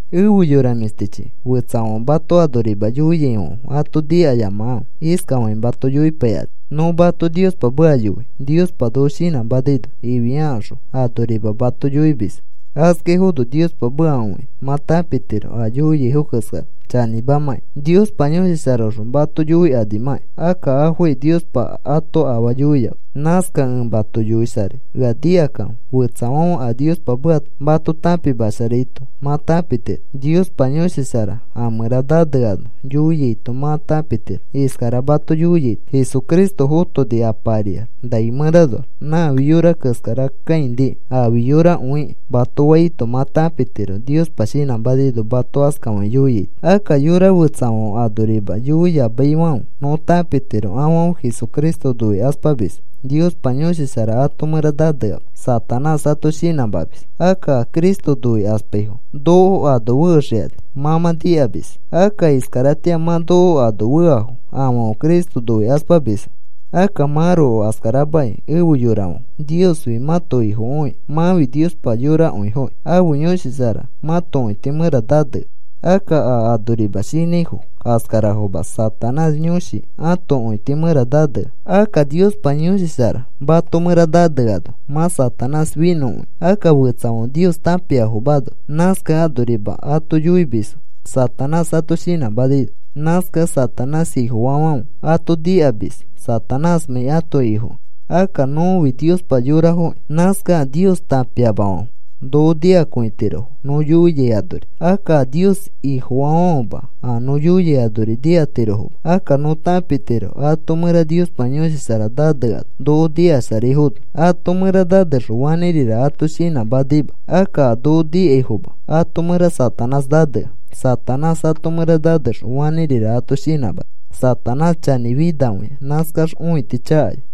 Efe yora mĩshtichi, fetsafãfe mato anorima yoiaifãfe ato nikayamakãfe. Iskafakĩ mato yoipaikani: “Nõ mato Niospa meka yoi Niospa noko shinãmanaino,” ifiakaxõ anorima mato yoimisfo. Askaifono Niospa meka õikĩ mã tãpitiro a yoiaifo keskara chanĩmamãkĩ. Niospa Yõshi Sharaõxõ mato yoikanimakĩ. Akka afokai Niospa ato afaa yoiama. Nãskakẽ ẽ mato yoisharai, ea nikakãfe. Fetsafãfe a Niospa meka mato tãpimasharaito mã tãpitiro. Niospa Yõshi Shara a mẽra naneano yoiaito mã tãpitiro. Iskara mato yoiaito: “Jesucristo fotoni Apa ariax nai mẽranoax. Nãfi yora keskara kãiniki. Aafi yorakõiki,” mato faito mã tãpitiro Niospa shinãmanaino mato askafakĩ yoiaito. Akka yora fetsafãfe anori yoiyamaifãfe nõ tãpitiro afãfe Jesucristo noikaspamisfo, Niospa Yõshi Shara ãto mẽra naneama. Satanás ato shinãmamis. Akka a Cristo noikaspaifo noko ano fexikani mã mã nikamis. Akka iskaratĩa mã noko ano feafo, afãfe Cristo noikaspamisfo. Akka mãroko askaramakĩ efe yorafãfe, Niosfi mãto Ifokõikĩ, mãfi Niospa yorakõifokĩ. Ãfe Yõshi Shara mã mãto õiti mẽra nanea. Akka a anorima shinãifo askarafoma, Satanás yõshi ãto õiti mẽra nanea. Akka Niospa Yõshi Shara mato mẽra naneano mã Satanás finõkõia. Akka fetsafãfe Nios tãpiafomano, nãskakẽ anorima ato yoimisfo, Satanás ato shinãmanaino. Nãskakẽ Satanás ifofaafãfe ato nikamis Satanásmãi ãto ifokẽ. Akka nõfi Niospa yorafokĩ. Nãskakẽ a Nios tãpiafãfe noko nikakõitirofo nõ yoiai anori. Akka a Nios Ifofaafãfema a nõ yoiai anori nikatirofoma. Akka nõ tãpitiro ato mẽra Niospa Yõshi Shara naneano noko nikasharaifono. Ato mẽra nanexõ fanĩrira ato shinãmanima. Akka a noko nikaifoma ato mẽra Satanás nanea. Satanás ato mẽra nanexõ fanĩrira ato shinãmani. Satanás chanĩ finakõia. Nãskax õiti chakaya.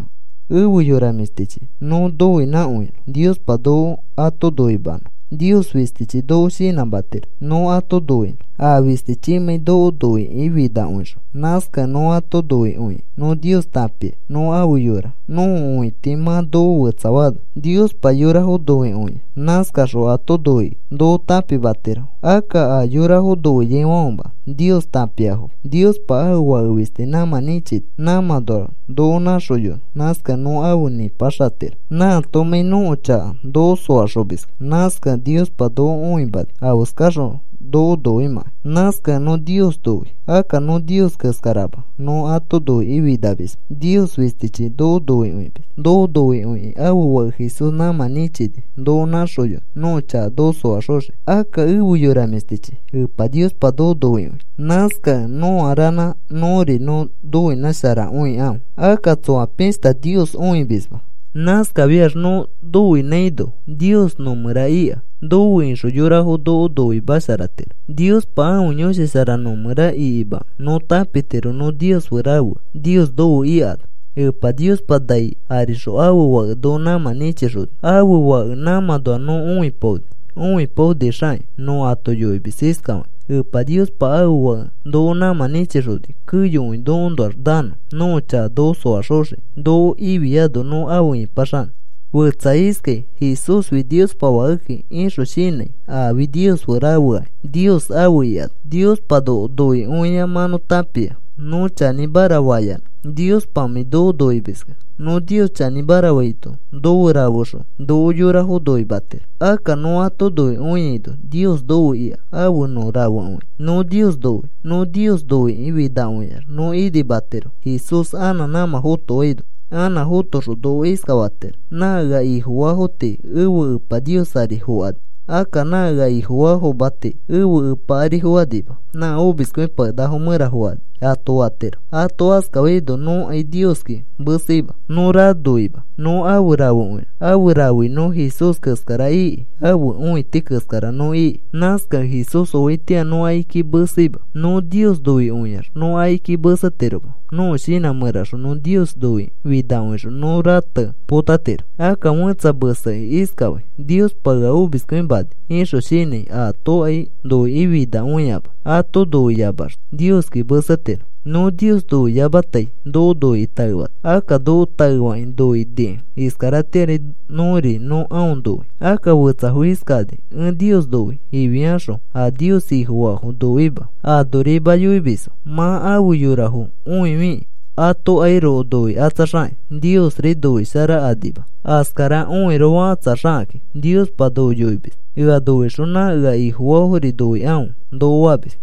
Efe yora mĩshtichi, nõ noinãkõinõ, Niospa noko ato noimanõ. Nios fistichi noko shinãmatiro nõ ato noinõ, a fistichimãi noko noikĩ finakõixõ. Nãskakẽ nõ ato noikõikĩ nõ Nios tãpia nõ afe yora, nõko õiti mã noko fetsafaano. Niospa yorafo noikõia. Nãskaxõ ato noikĩ noko tãpimatiro. Akka a yorafo noiaifãfema, Nios tãpiafoma. Niospa ãfe Fake fisti nãmã nĩchini, nãmãnoax noko nãxoyonõ. Nãskakẽ nõ afe nĩpaxatiro, nãatomãi nõko chaka noko soaxomiskẽ. Nãskakẽ Niospa noko õimani afeskaxõ noko noimãkai. Nãskakẽ nõ Nios noi. Akka nõ Nios keskarama, nõ ato noikĩ finamisma. Nios fistichi noko noikõimis. Noko noikõikĩ ãfe Fake Jesús nãmã nĩchini noko nãxoyonõ nõko chaka noko soaxoxiki. Akka efe yora mĩshtichi, Epa Niospa noko noikõi. Nãskakẽ nõa ranã nõri nõ noinãsharakõikãfe. Akka tsoa pishta Nios õimisma. Nãskafiax nõ noinãino, Nios nõmẽra ika. Nofe ixõ yorafo noko noimasharatiro. Niospa ãfe Yõshi Shara nõmẽra ikimakẽ nõ tãpitiro nõ Nios fe rafea, Nios nofe ikano. Epa Niospa nai arixõ ãfe Fake noko nãmã nĩchixoni. Ãfe Fake nãmãnoa nõ õipaoni. Õipaonixakĩ nõ ato yoimis iskafakĩ: “Epa Niospa ãfe Fake noko nãmã nĩchixoni, keyokõi nokoõnoax nanõ nõko chaka noko soaxoxiki noko ifiano nõ afe ipaxanõ.” Fetsa iskai: “Jesúsfi Niospa Fakeki,” ixõ shinãi. Aafi Nios fe rafeakĩ Nios afe ikano. Niospa noko noikõia mã nõ tãpia, nõ chanĩmara faiyanã, Niospamãi noko noimiskẽ. Nõ Nios chanĩmara faito nofe rafexõ noko yorafo noimatiro. Akka nõ ato noikõiaino Nios nofe ika, afe nõ rafekõia. Nõ Nios noi. Nõ Nios noikĩ finakõiax nõ inimatiro Jesús anã nãmã fotoano. Anã fotoxõ noko iskafatiro: “Nã ea Ifofaafo tii ẽfe Epa Nios ari fokani. Akka nã ea Ifofaafoma tii ẽfe Epa ari fokanima, nã omiskõipakenakafo mẽra fokani,” ato fatiro. Ato askafaino nõkai Nioski meseima. Nõ ranoima nõ afe rafekõi. Afe rafei nõ Jesús keskara iki, ãfe õiti keskara nõ iki. Nãskakẽ Jesús oaitĩa nõ akiki meseima. Nõ Nios noikõiax nõ akiki mesetiroma. Nõko shinã mẽraxõ nõ Nios noikĩ finakõixõ nõ rate potatiro. Akka fẽtsa mesekĩ iskafai: “Niospa ea omiskõimani,” ixõ shinãi aatokai noikĩ finakõiama. Ato noikõiamax Nioski mesetiro. Nõ Nios noiyamatai noko noikĩ taefani. Akka noko taefakĩ noinikẽ iskaratĩari nõri nõ aõ noi. Akka fetsafo iskakani: “Ẽ Nios noi,” ifiaxõ a Nios Ifofaafo noima, anorima yoimisfo. Mã afe yorafo õifikĩ atokairoko noikatsaxakakĩ, Niosri noisharakanima askara õiroko fakatsaxakakĩ. Niospa noko yoimis: “Ea noixõ nã ea Ifofaafori noikãfe,” noko famis.